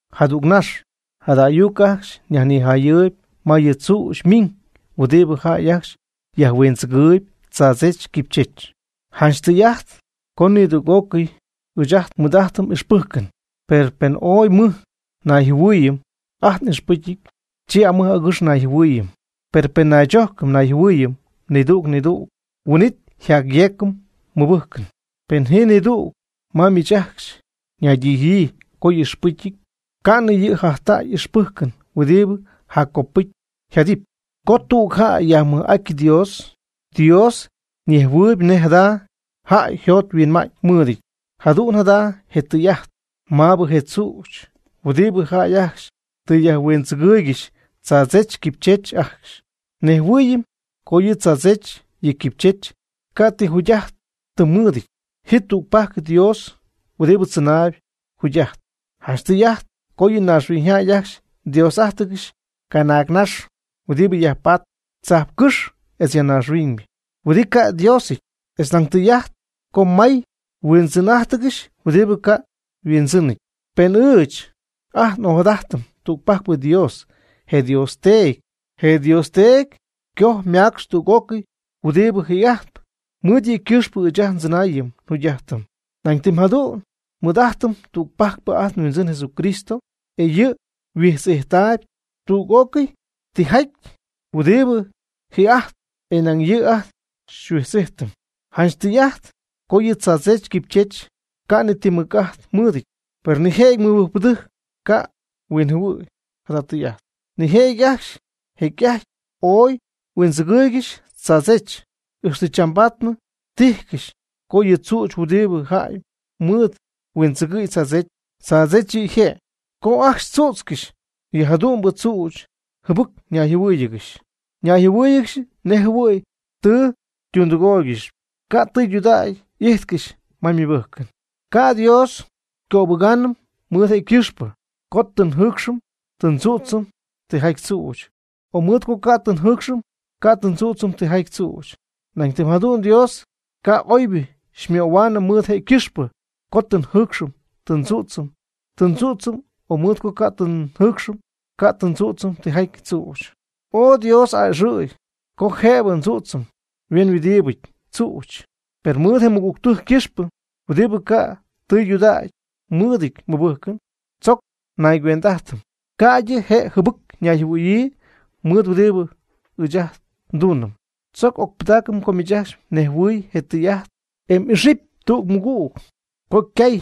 Jadüg nax, jada ayuc ajcxy nyajnijayɨɨyb ma yɨ tzüch ymiñ huɨdibɨ jäy ajcxy yajhuindzɨgɨɨyb tzaadzech quipychech. Janch tɨy'ajt co nidüg'ócɨy ɨɨch ajt nmɨɨd'ajtɨm ixpɨjcɨn. Per pen ooy mɨj nayjɨhuɨɨyɨm ajt n'ixpɨcyɨty, chi amɨj agɨx nayjɨhuɨɨyɨm. Per pen naychojcɨm nayjɨhuɨɨyɨm nidüg nidüg, huin'it nyajyeecɨm nmɨbɨjcɨn. Pen ji nidüg ma miich ajcxy ñaydijyii co y'ixpɨcyɨty, ca'nɨ yɨ' jajtäy ixpɨjcɨn huɨdibɨ jaccopɨcy yjadɨpy. Co tüg jäy yajmɨj'aty Dios, Dios ñejhuɨɨyb nej jada jäy yjot yhuinma'ñ mɨɨdɨty. Jadu'n jada je tɨy'ajt maabɨ je tzüch huɨdibɨ jäy ajcxy tɨ yajhuindzɨgɨɨygɨxy tzaadzech quipychech ajcxy. Nejhuɨɨyɨm co yɨ tzaadzech yɨ quipychech ca' ti jugy'ajtɨn mɨɨdɨty. Ji tügpajc Dios huɨdibɨ tzɨnaayb jugy'ajtp. Janch tɨy'ajt co yɨ naaxhuiñyjäy ajcxy Dios'ájtɨgɨxy canaagnax huɨdibɨ yajpatp tzajpcɨ́x etz ya naaxhuiñ huɨdibɨ ca' Diosɨty. Etz nañ tɨy'ajt co may yhuindzɨn'ajtcɨxy huɨdibɨ ca' yhuindzɨnɨty. Per ɨɨch ajt n'ojadajtɨm tügpajcpɨ Dios, je Dios Teedy. Je Dios Teedy coj macx tüg'ócɨy huɨdibɨ ji'ajtp. Mɨɨd yɨ' ycɨxpɨ ɨɨch ajt ndzɨnaayɨm njugy'ajtɨm. Nañ tɨm jadu'n nmɨɨd'ajtɨm tügpajcpɨ ajt nHuindzɨn Jesucristo, e yɨ' huijtz'ijtaayb tüg'ócɨy tijaty huɨdibɨ ji'ajtp, e nañ yɨ' ajt xyhuijtz'ijtɨm. Janch tɨy'ajt co yɨ tzaadzech quipychech ca' ti mɨc'ajt mɨɨdɨty, per nije'jɨty mɨbɨjcpɨdɨjc ca' huinjɨhuɨ̈y jada tɨy'ajt. Nijëjɨty ajcxy jecy'ajty ooy huindzɨgɨɨygɨxy tzaadzech, ixtɨ chambaadnɨ tijcɨxy co yɨ tzüch huɨdibɨ jäy mɨɨd huindzɨgɨ̈y tzaadzech, tzaadzech yɨ' yje'. Co ajcxy tzüdzcɨxy yɨ jadu'mbɨ tzüch, jɨbɨc nayjɨhuɨ́ɨyɨgɨxy, nayjɨhuɨ́ɨyɨgɨxy nejjɨhuɨ̈y tɨ ytundɨgooygɨxy. Ca' tɨydudägy y'ijtcɨxy ma ymɨbɨjcɨn. Ca' Dios xycöbɨgaanɨm mɨɨd je' ycɨxpɨ co tɨ njɨɨcxɨm tɨ ndzüdzɨm tijaty tzüch, o mɨɨd co ca' tɨ njɨɨcxɨm ca' tɨ ndzüdzɨm tijaty tzüch. Nañ tɨm jadu'n Dios ca' oybɨ xymöhuaanɨm mɨɨd je' ycɨxpɨ co tɨ njɨɨcxɨm tɨ ndzüdzɨm ti tzüch, o mɨɨd co ca' tɨ njɨɨcxɨm ca' tɨ ndzüdzɨm tijaty tzüch. Oy Dios a'ɨxɨ̈y co jëbɨ ndzüdzɨm huenhuɨdibɨ tzüchɨty. Per mɨɨd je mɨgügtɨjc ycɨxpɨ huɨdibɨ ca' tɨydudägy mɨɨdɨty ymɨbɨjcɨn, tzoc naygüend'ajtɨm ca'ydɨ je' jɨbɨc yñayjɨhuɨ̈yii mɨɨd huɨdibɨ ɨɨch ajt ndunɨm. Tzoc ocpɨdaacɨm co miich ajcxy mnejhuɨ̈y je tɨy'ajt, e xy'ixɨpy tüg mɨgüg co mgay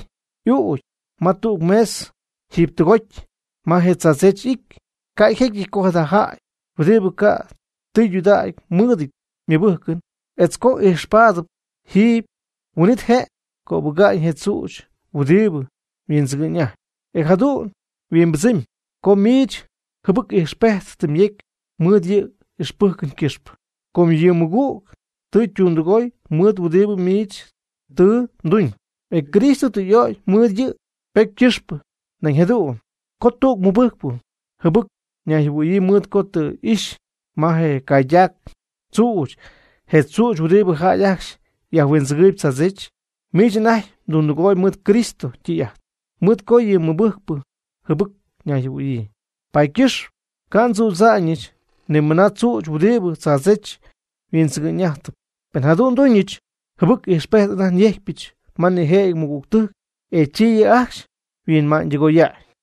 m'uucy ma tüg mesa jiiby tɨgoty me je tzaadzech y'ity. Ca' jecyɨty co jada jäy huɨdibɨ ca' tɨydudägy mɨɨdɨty ymɨbɨjcɨn, etz co xy'ixpaadɨpy jiiby, huin'it je' cöbɨga'ñ je tzüch huɨdibɨ huindzɨgɨ'ñ'ajtp. E jadu'n yhuimbɨdzɨmy co miich jɨbɨc ijxpejt tɨ myecy mɨɨd yɨ m'ixpɨjcɨn ycɨxpɨ, com yɨ mmɨgüg tɨ ytundɨgoy mɨɨd huɨdibɨ miich tɨ mduñ. E Cristo tɨ y'ögy mɨɨd yɨ' ypocy ycɨxpɨ nañ jadu'n. Co tüg mɨbɨjcpɨ jɨbɨc nayjɨhuɨ̈yii mɨɨd co tɨ xy'ixy ma je caydac mdzüch je tzüch huɨdibɨ jäy ajcxy yajhuindzɨgɨɨyb tzaadzech, miich anajty tundɨgooyb mɨɨd Cristo ytɨy'ajt, mɨɨd co yɨ mɨbɨjcpɨ jɨbɨc ñayjɨhuɨ̈yii. Paady ycɨxp ca' ndzüdza'ñɨch ni mɨna tzüch huɨdibɨ tzaadzech yhuindzɨgɨ'ñ'ajtɨp. Pen jadu'n nduñɨch, jɨbɨc ijxpejt anajty nyejcpyɨch ma nijëjɨty mɨgügtɨjc, e chi yɨ' ajcxy yhuinma'ñytɨgoya'ñ.